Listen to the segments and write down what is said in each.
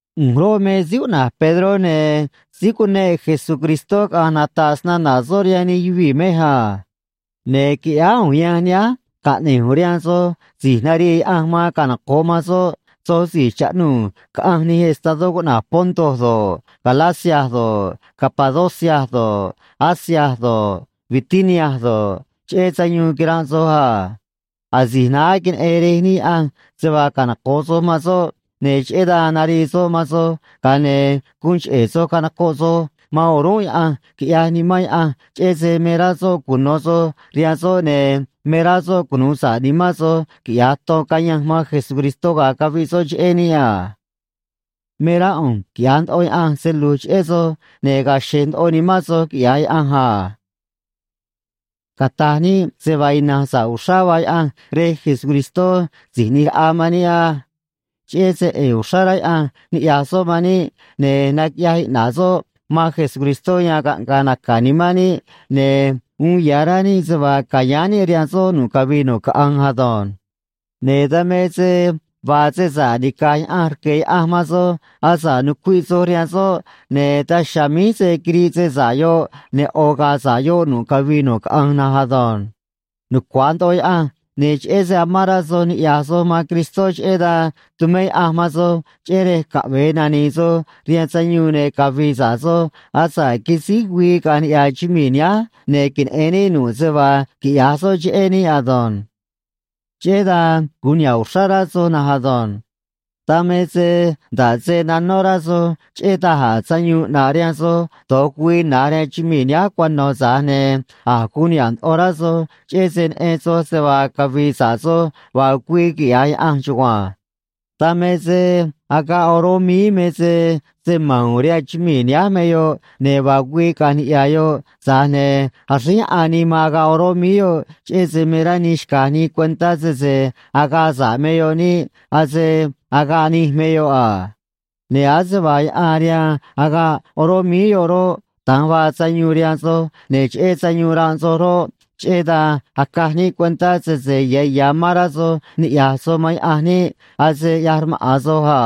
ꞌU̱nj roꞌ, me síí cuꞌna̱j Pedró, ne̱ síí cuneꞌ Jesucristó caꞌa̱nj nata̱ꞌ snana̱ soꞌ rihaan nij yuvii̱ mej a. Ne̱ qui̱ꞌyáá ꞌu̱nj yanj nihánj caꞌne̱j ꞌu̱nj rihaan soj si̱j narii Yaꞌanj man canoco̱ꞌ man soꞌ, soj si̱j chaꞌnuu̱ caꞌanj nij estadó cuꞌna̱j Ponto do̱ꞌ, Galacia do̱ꞌ, Capadocia do̱ꞌ, Asia do̱ꞌ, Bitinia do̱ꞌ, cheꞌé sayuun quiranꞌ soj a. Asi̱j naá queneꞌen Rej níꞌ Yaꞌanj se vaa canoco̱ꞌ soj man soꞌ, ne̱ cheꞌé dan narii soꞌ man soj, ga̱a ne̱ guun cheꞌe̱ soj canocoꞌ soj man o̱rúnꞌ Yaꞌanj, quiꞌyaj Nimán Yaꞌanj, cheꞌé se me rá soꞌ cuno̱ soj rihaan soꞌ, ne̱ me rá soꞌ cunu̱u sa̱ꞌ nimán soj quiꞌya̱j ton cayanj man Jesucristó ga̱a caviꞌ soꞌ cheꞌé níꞌ a. Me rá ꞌu̱nj quiꞌya̱j ndoꞌo Yaꞌanj se lu̱j cheꞌé soj, ne̱ ga̱a̱ xe̱j ndoꞌo nimán soj quiꞌya̱j Yaꞌanj a. Cata̱j níꞌ se vaa ina̱nj sa̱ꞌ uxrá vaa Yaꞌanj Rej Jesucristó Si̱j ꞌNi̱j Raꞌa man níꞌ á. Cheꞌé se ꞌe̱e̱ uxrá rá Yaꞌanj niꞌya̱j soꞌ man níꞌ, ne̱ naquiꞌyaj iꞌna̱ꞌ soꞌ man Jesucristó, yan caꞌnga̱a̱ naca̱ nimán níꞌ ne̱ uun ya̱ rá níꞌ se vaa ca̱yáán níꞌ rihaan soꞌ nu̱ꞌ cavii nu̱ꞌ caꞌanj ado̱nj. Ne̱ dan me se vaa se sa̱ꞌ nica̱j Yaꞌanj rque̱ Yaꞌanj man soj asa̱ꞌ nucuiꞌ soj rihaan soꞌ, ne̱ daj chiha̱a̱ míj se̱ quiriꞌ se sa̱ꞌ yoꞌ, ne̱ ꞌo̱ ga̱a̱ sa̱ꞌ yoꞌ nu̱ꞌ cavii nu̱ꞌ caꞌanj na̱nj ado̱nj. Nucua̱j ndoꞌo Yaꞌanj, ne̱ cheꞌé se amán rá soj niꞌya̱j soj man Cristó, cheꞌé dan tumé Yaꞌanj man soj, cheꞌé rej caꞌve̱e nani̱i̱ soj rihaan sayuun ne̱ cavi̱i̱ sa̱ꞌ soj asa̱ꞌ quisíj güii caꞌa̱nj niꞌya̱ chumii̱ nihánj ne̱ queneꞌe̱n níꞌ nu̱ꞌ se vaa quiꞌya̱j soꞌ cheꞌé níꞌ ado̱nj. Cheꞌé dan guun niha̱ꞌ uxrá rá soj na̱nj ado̱nj. Dan me se nda̱ꞌ se nanó rá soj cheꞌé da̱j a̱ sayuun ꞌnaꞌ rihaan soj do̱j güii na̱nj rihaan chumii̱ nihánj cuano̱, tza̱j ne̱ a̱j guun niha̱ꞌ ndoꞌo rá soj, cheꞌé se neꞌen soj se vaa cavi̱i̱ sa̱ꞌ soj vaa güii, quiꞌya̱j Yaꞌanj chugua̱nj. Dan me se agaꞌ oró míí me se se ma̱n u̱u̱n rihaan chumii̱ nihánj me yoꞌ, ne̱ vaa güii caꞌa̱nj niꞌya̱ yoꞌ, tza̱j ne̱ axríj yaꞌan nii man agaꞌ oró míí yoꞌ, cheꞌé se me rá nii xca̱j nii cuentá sese agaꞌ sa̱ꞌ me yoꞌ niꞌ, ase agaꞌ nij me yoꞌ a. Ne̱ ase vaa yaꞌan rihaan agaꞌ oró míí yoꞌ roꞌ, da̱nj vaa sayuun rihaan soj, ne̱ cheꞌé sayuun ranꞌ soj roꞌ, cheꞌé dan acaj níꞌ cuentá sese ya̱ ya̱ amán rá soj niꞌya̱j soj man Yaꞌanj niꞌ, ase ꞌyaj rmaꞌa̱n soj a.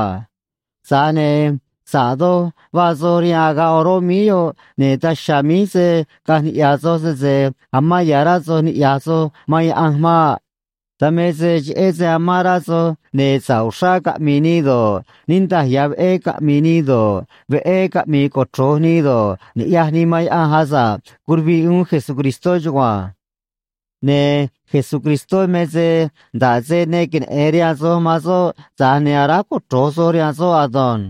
Tza̱j ne̱ sa̱ꞌ doj vaa soj rihaan agaꞌ oró míí yoꞌ, ne̱ daj chiha̱a̱ míj se̱ caꞌanj niꞌya̱ soj, sese amán ya̱ rá soj niꞌya̱j soj man Yaꞌanj maꞌ. Dan me se cheꞌé se amán rá soj, ne̱ sa̱ꞌ uxrá caꞌmi̱i̱ nii do̱ꞌ, niꞌndaj ya̱ veꞌé caꞌmi̱i̱ nii do̱ꞌ, veꞌé caꞌmi̱i̱ cochro̱j nii do̱ꞌ, ni̱ꞌyaj nii man Yaꞌanj, asa̱ꞌ curuviꞌ uún Jesucristó chugua̱nj. Ne̱ Jesucristó me se nda̱ꞌ se ne queneꞌe̱n rihaan soj man soꞌ, tza̱j ne̱ aráj cochro̱j soj rihaan soꞌ ado̱nj.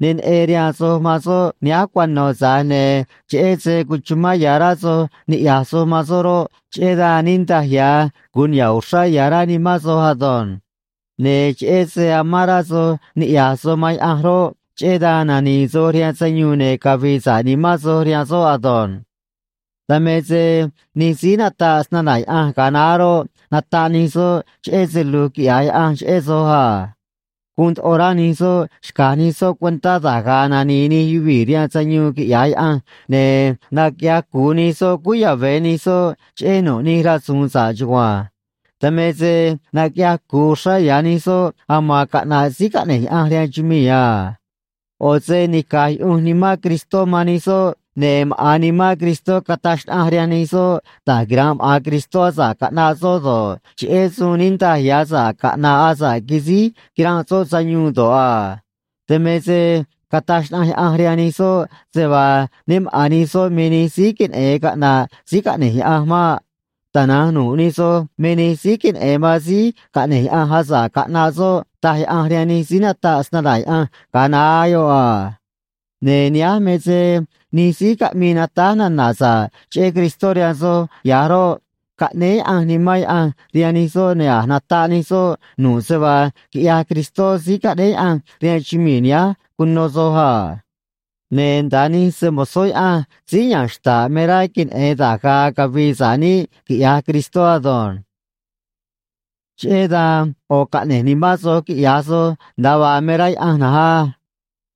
Ne neꞌen rihaan soj man soꞌ nihánj cuano̱, tza̱j ne̱ cheꞌé se cuchumán ya̱ rá soj niꞌya̱j soj man soꞌ roꞌ, cheꞌé dan niꞌndaj ya̱ guun niha̱ꞌ uxrá ya̱ rá nimán soj ado̱nj. Ne̱ cheꞌé se amán rá soj niꞌya̱j soj man Yaꞌanj roꞌ, cheꞌé dan nani̱i̱ soj rihaan sayuun ne̱ cavi̱i̱ sa̱ꞌ nimán soj rihaan soꞌ ado̱nj. Dan me se nij síí nataꞌ snana̱ Yaꞌanj ga̱a naá roꞌ, nataꞌ nij soꞌ cheꞌé se lu̱j quiꞌya̱j Yaꞌanj cheꞌé soj a. Guun ndoꞌo rá nij soꞌ xca̱j nij soꞌ cuentá da̱j ga̱a̱ nani̱i̱ nij yuvii̱ rihaan sayuun quiꞌya̱j Yaꞌanj, ne̱ naquiꞌyaj cu̱u nij soꞌ cúú yave̱ nij soꞌ cheꞌé nu̱ꞌ nij rasu̱u̱n sa̱ꞌ chugua̱nj. Dan me se naquiꞌyaj cu̱u uxrá ya̱ nij soꞌ aman caꞌna̱ꞌ síí caꞌne̱j Yaꞌanj rihaan chumii̱ a. ꞌO̱ se nica̱j yuꞌunj Nimán Cristó man nij soꞌ, ne̱ maꞌa̱n Nimán Cristó cataj xnaꞌanj rihaan nij soꞌ da̱j quira̱nꞌ maꞌa̱n Cristó asa̱ꞌ caꞌnaꞌ soꞌ do̱ꞌ, cheꞌé suun niꞌndaj ya̱ sa̱ꞌ caꞌna̱ꞌ asa̱ꞌ quisíj quiranꞌ soꞌ sayuun do̱ꞌ a. Dan me se cataj xnaꞌanj Yaꞌanj rihaan nij soꞌ se vaa né maꞌa̱n nij soꞌ me nij síí queneꞌe̱n caꞌna̱ꞌ síí caꞌne̱j Yaꞌanj maꞌ. Tana̱nj nu̱ꞌ nij soj me nij síí queneꞌe̱n man síí caꞌne̱j Yaꞌanj, asa̱ꞌ caꞌnaꞌ soꞌ, taj Yaꞌanj rihaan nij síí nataꞌ snana̱ Yaꞌanj ga̱a naá yoꞌ a. Ne̱ nihánj me se nij síí caꞌmii natáj nana̱ sa̱ꞌ cheꞌé Cristó rihaan soj ya̱j roꞌ, caꞌnéé Yaꞌanj Nimán Yaꞌanj rihaan nij soꞌ, ne̱ a̱j nataꞌ nij soꞌ nu̱ꞌ se vaa quiꞌyaj Cristó síí caꞌnéé Yaꞌanj rihaan chumii̱ nihánj cuno soj a. Ne̱ nda̱a nij se‑mo̱zó Yaꞌanj síí ya̱nj xta̱ꞌ me rá queneꞌe̱n da̱j ga̱a̱ cavi̱i̱ sa̱ꞌ níꞌ quiꞌya̱j Cristó ado̱nj. Cheꞌé dan ꞌo̱ caꞌne̱j nimán soj quiꞌya̱j soj nda̱a vaa me rá Yaꞌanj na̱nj á.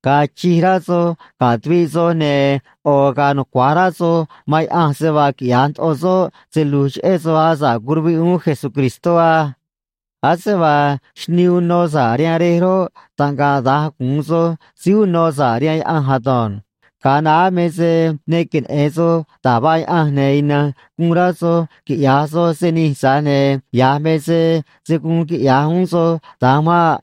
Ga̱a̱ chij rá soj ga̱ tuviꞌ soj, ne̱ ꞌo̱ ga̱a̱ nucua̱j rá soj man Yaꞌanj se vaa quiꞌya̱j ndoꞌo soꞌ se lu̱j cheꞌé soj asa̱ꞌ curuviꞌ uún Jesucristó á. Ase vaa xnii uno sa̱ꞌ rihaan rej roꞌ, taꞌngaꞌ da̱nj gu̱un soj síí uno sa̱ꞌ rihaan Yaꞌanj ado̱nj. Ga̱a naá me se ne queneꞌe̱n soj da̱j vaa Yaꞌanj, ne̱ ina̱nj guun rá soj quiꞌya̱j soj se nij, tza̱j ne̱ ya̱j me se se̱ guun quiꞌya̱j uún soj da̱nj maꞌ.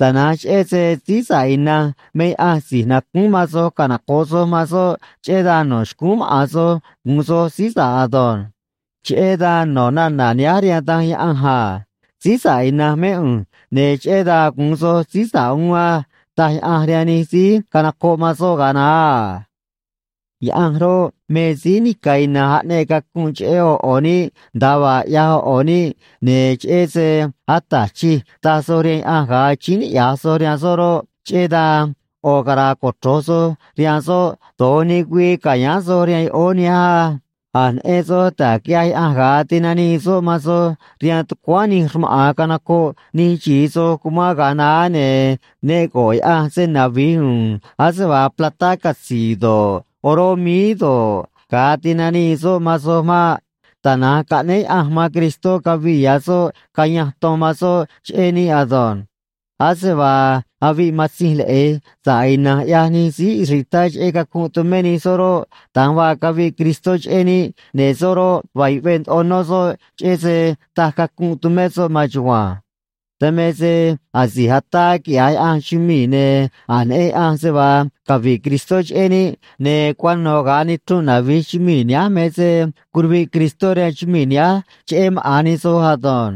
Tana̱nj cheꞌé se síí sa̱ꞌ ina̱nj me Yaꞌanj si̱j nacúún man soj canoco̱ꞌ soj man soꞌ, cheꞌé dan no̱ xcúún maꞌa̱n soj gu̱un soj síí sa̱ꞌ ado̱nj. Cheꞌé dan no̱ nana̱ nihánj rihaan Danj Yaꞌanj a: “Síí sa̱ꞌ ina̱nj mé ꞌu̱nj, ne̱ cheꞌé dan gu̱un soj síí sa̱ꞌ uún á”, taj Yaꞌanj rihaan nij síí canocoꞌ man soꞌ ga̱a naá a. Yaꞌanj roꞌ, me síí nica̱ ina̱nj aꞌneꞌ cacunꞌ cheꞌé ꞌo̱ ꞌo̱ níꞌ nda̱a vaa ꞌyaj ꞌo̱ ꞌo̱ níꞌ, ne̱ cheꞌé se “Ata̱j Chij” taj soj rihaan Yaꞌanj ga̱a achíín niꞌya̱j soj rihaan soꞌ roꞌ, cheꞌé dan ꞌo̱ cara̱a̱ cochro̱j soj rihaan soꞌ do̱j nij güii ca̱yáán soj rihaan yoꞌóó nihánj á. A̱j neꞌen soj da̱j quiꞌyaj Yaꞌanj ga̱a tinanii soꞌ man soj rihaan tucuáán nij rmaꞌa̱n canocoꞌ nij xi̱i soj síí cumán ga̱a naá, ne̱ ne go̱ꞌ Yaꞌanj se navi̱j u̱u̱n ase vaa platá catzi̱i̱ do̱ꞌ, oró míí do̱ꞌ, ga̱a tinanii soꞌ man soj maꞌ. Tana̱nj caꞌnéé Yaꞌanj man Cristó cavi̱ꞌ ya̱ soꞌ caya̱nj ton man soꞌ cheꞌé níꞌ ado̱nj. Ase vaa aviꞌ matzinj leꞌe̱j sa̱ꞌ ina̱nj ꞌyaj nij síí israelitá cheꞌé cacunꞌ tumé nij soꞌ roꞌ, da̱nj vaa caviꞌ Cristó cheꞌé níꞌ, ne̱ soꞌ roꞌ, vaa yuꞌvee ndoꞌo nó soꞌ cheꞌé se taj cacunꞌ tumé soꞌ maan chugua̱nj. Dan me se asi̱j ataa quiꞌya̱j Yaꞌanj chumii̱, ne̱ a̱j neꞌen Yaꞌanj se vaa cavi̱ꞌ Cristó cheꞌé níꞌ, ne̱ cuano̱ ga̱a nichrunꞌ navi̱j chumii̱ nihánj me se curuviꞌ Cristó rihaan chumii̱ nihánj cheꞌé maꞌa̱n nij soj ado̱nj.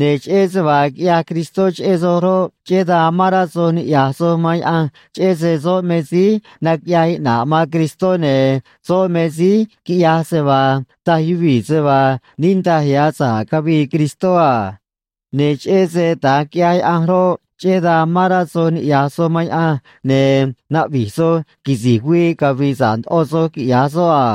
Ne̱ cheꞌé se vaa quiꞌyaj Cristó cheꞌé soj roꞌ, cheꞌé dan amán rá soj niꞌya̱j soj man Yaꞌanj cheꞌé se soꞌ me síí naquiꞌyaj iꞌna̱ꞌ man Cristó, ne̱ soꞌ me síí quiꞌyaj se vaa taj yuvii̱ se vaa niꞌndaj ya̱ sa̱ꞌ cavii Cristó a. Ne̱ cheꞌé se da̱nj quiꞌyaj Yaꞌanj roꞌ, cheꞌé dan amán rá soj niꞌya̱j soj man Yaꞌanj, ne̱ naꞌvi̱j soj quisi̱j güii cavi̱i̱ sa̱ꞌ ndoꞌo soj quiꞌya̱j soꞌ a.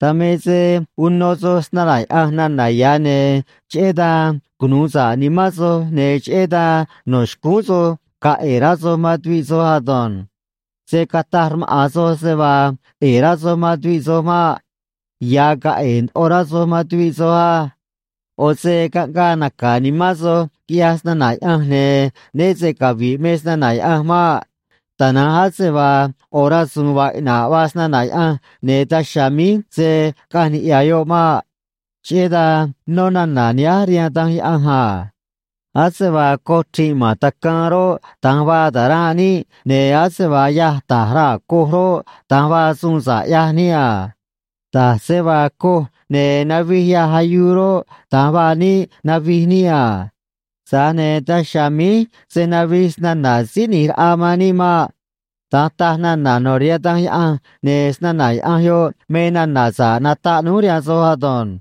Dan me se uno soj snana̱ Yaꞌanj nana̱ ya̱, ne̱ cheꞌé dan cunuu sa̱ꞌ nimán soj, ne̱ cheꞌé dan no̱ xcúún soj ga̱a̱ ꞌe̱e̱ rá soj man tuviꞌ soj ado̱nj. Se̱ cataj rmaꞌa̱n soj se vaa ꞌe̱e̱ rá soj man tuviꞌ soj maꞌ. Ya̱ ga̱a̱ ꞌe̱e̱ ndoꞌo rá soj man tuviꞌ soj á. ꞌO̱ se caꞌngaa naca̱ nimán soj, quiꞌyaj snana̱ Yaꞌanj, ne̱ né se cavi̱ꞌ me snana̱ Yaꞌanj maꞌ. Tana̱nj ase vaa ꞌo̱ rasu̱u̱n vaa iꞌna̱ꞌ vaa snana̱ Yaꞌanj, ne̱ daj chiha̱a̱ míj se̱ caꞌanj niꞌya̱ yoꞌ maꞌ. Cheꞌé dan nó nana̱ nihánj rihaan Danj Yaꞌanj a: Ase vaa coj chri̱nꞌ ma̱n tacaan roꞌ, da̱nj vaa ta̱ranꞌ níꞌ, ne̱ ase vaa yâj ta̱j raa̱ coj roꞌ, da̱nj vaa suun sa̱ꞌ ꞌyaj níꞌ a. Da̱j se vaa coj ne̱ navij yâj ayuu roꞌ, da̱nj vaa níꞌ navij níꞌ a. Tza̱j ne̱ daj chiha̱a̱ míj se̱ navij snana̱ Síí ꞌNi̱j Raꞌa man níꞌ maꞌ. Da̱nj taj nana̱ no̱ rihaan Danj Yaꞌanj, ne̱ snana̱ Yaꞌanj yoꞌ me nana̱ sa̱ꞌ nataꞌ núj rihaan soj ado̱nj.